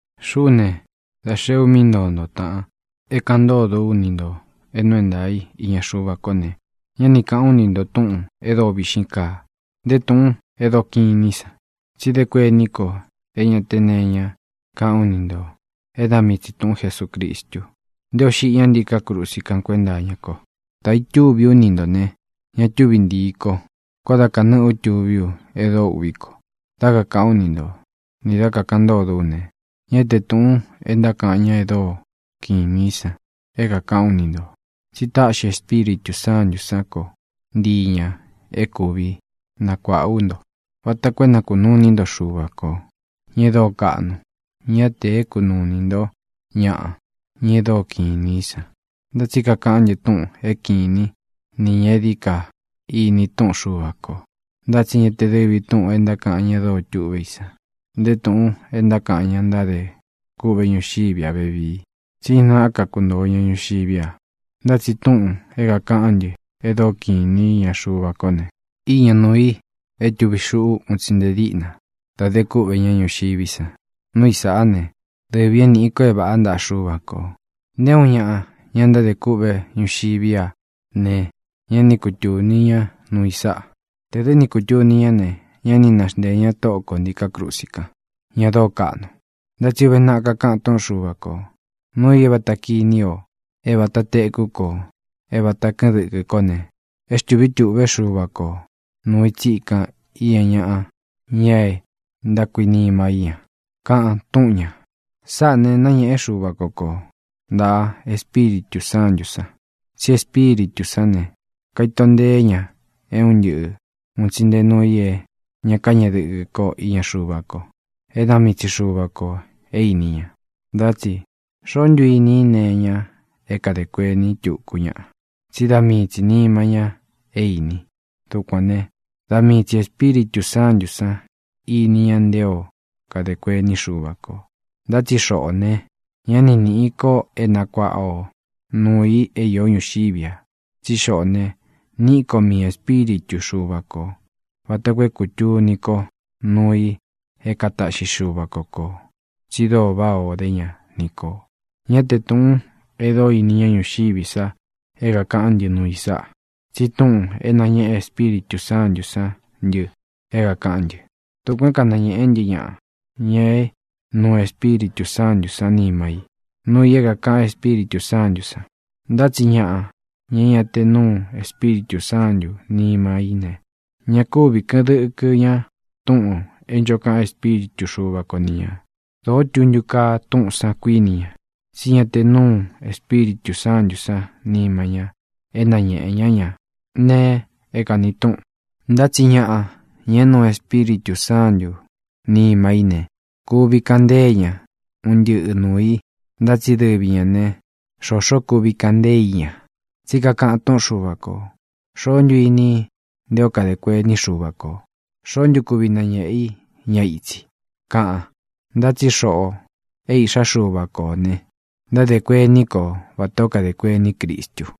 Xuꞌú ne, dā xeé u mí ntoo nto, tāꞌan, é kāꞌan ntódo ú ni ntō é nuu é ntaā í iña Xuva kó ne, ñá ni kāꞌán u ni nto túꞌūn e dóo viꞌxín kaa, nté túꞌūn e dóo kiꞌin inī í san. Tsi dé kuení ko é ña te nee iñá kaꞌán u ni ntō é da mii tsī túꞌun Jesūcristu, nté ō xiꞌi ñá ntíkā krusi kan kuénta iña ko. Dā itúvī ú ni ntō ne, ña túvi ntiī ko. Koó da kanɨ́ꞌɨ u tuví u e dóo uꞌví ko. Dá kakāꞌán u ni nto, nī dá kakāꞌan ntódo ú ne, ñá tē túꞌūn e ntákaꞌan ña e dóo kiꞌin inī í san é kākaꞌán u ni ntō, tsí táꞌxi Espíritū Sántū sán ko ntii ñā é kuvi nakuāꞌá u nto, vata koo é na kunuu inī ntó Xuva ko, ña e dóo kaꞌnu, ña te é kunuu inī ntó ñaꞌa, ña e dóo kiꞌin inī í san. Ntá tsi kakaꞌán ntɨ túꞌūn é kiꞌin īní ni ñā e dií ka ini túꞌun Xuva kō. Ntá tsi ña te dɨvī túꞌūn e ntákaꞌan ña dóo tuꞌvé i san, nté tūꞌun e ntákaꞌan ña ntádē kûꞌvé ñuxiví a vevii, tsí ña náꞌa ka kuntōo ña ñuxiví a. Ntá tsi túꞌūn é kākaꞌán ntɨ e dóo kiꞌin īní iña Xuva kó ne, iña nuu i é tūvi xuꞌu un tsi nte díꞌna da de kúꞌve ñá ñuxiví san. Núu i sāꞌá ne, dɨvī é nīꞌi ko é vāꞌá ntaꞌa Xuva kō. Nté uun ñaꞌa, ña ntádē kûꞌvé ñuxiví a ne, ñá ni kutūni ñá nuu i sáꞌa. Tē dɨ́ ni kutūni ñá ne, ñá ni naxnteē ñá Tóꞌo kō ntiká krusi kan, ña dóo kaꞌnu. Ntá tsi uve naꞌa kakaꞌan túꞌun Xuva kō: Núu ī é vāta kiní o, é vāta tekú kō, é vāta kɨꞌɨn dɨkɨ kó ne, é xtūví tūꞌvé Xuva ko nūu i tsíkan iña ñaꞌa, ña é ntákuinima í ña, kaꞌan túꞌun ñā. Sáꞌā ne, náñēꞌé Xuva ko ko ntāꞌa Espíritū Sántū san. Tsí Espíritū sán ne, kaito nteé ña é un ntɨꞌɨ ūn tsi nte nuu i é ña káñeꞌe dɨkɨ ko iña Xuva ko, é da mii tsi Xuva kō é īni ña. Ntá tsi ¿xoó ntu ini i nee iña é kadē kuení tuku ñaꞌa? Tsí da mii tsi nīma ña é īni. Dukuān né, da mii tsī Espíritū Sántū san íni ña nté o kadē kuení Xuva kō. Ntá tsi xoꞌō ne, ñá ni nīꞌi ko é nakuaꞌa o nuū i é īó ñuxiví a, tsí xoꞌō ne, níꞌi ko miī Espíritu Xuva kō vata koo é kūtuni ko nuu i é kataꞌxi Xuva ko kō tsi dóo váꞌā ó de ña ni kō. Ñá tē túꞌūn e dóo ini ñá ñuxiví sa é kākaꞌán ntɨ nuu i sáꞌa, tsi túꞌūn é nañéꞌe Espíritū Sántū sán ntɨ é kākaꞌán ntɨ. Dukuān é kanañēꞌé ntɨ ñaꞌa, ña é nuu Espíritū Sántū san níma i, núu ī é kākaꞌan Espíritū Sántū san. Ntá tsi ñaꞌa, ña é ña te núu Espíritū Sántū nima í ne, ña kúvi kɨ̄ꞌɨn dɨkɨ ña túꞌūn é ncho kaꞌan Espíritu Xuva ko ni ñā. Dōó tuntu kaa túꞌūn san, kuíni ña, tsí ña te núu Espíritū Sántū san níma ña é nañēꞌe ñá ña nee é kāni túꞌun. Ntá tsi ñaꞌa, ña é nuu Espíritū Sántū nima í ne, kuvi kaꞌan ntée ña un ntɨꞌɨ nuū i. Ntá tsi dɨvi ñā ne, xoxó kuvi kaꞌan ntée i ña. Tsí kakaꞌan túꞌun Xuva kō: “¿Xoó ntu ini i nté o kadē kuení Xuva kō? ¿Xoó ntu kuvi nañēꞌé i ña itsi?”, kaꞌan. Ntá tsi xoꞌō é iꞌxá Xuva ko ō ne, ntádē kuení ko vatā ó kadē kuení Cristu.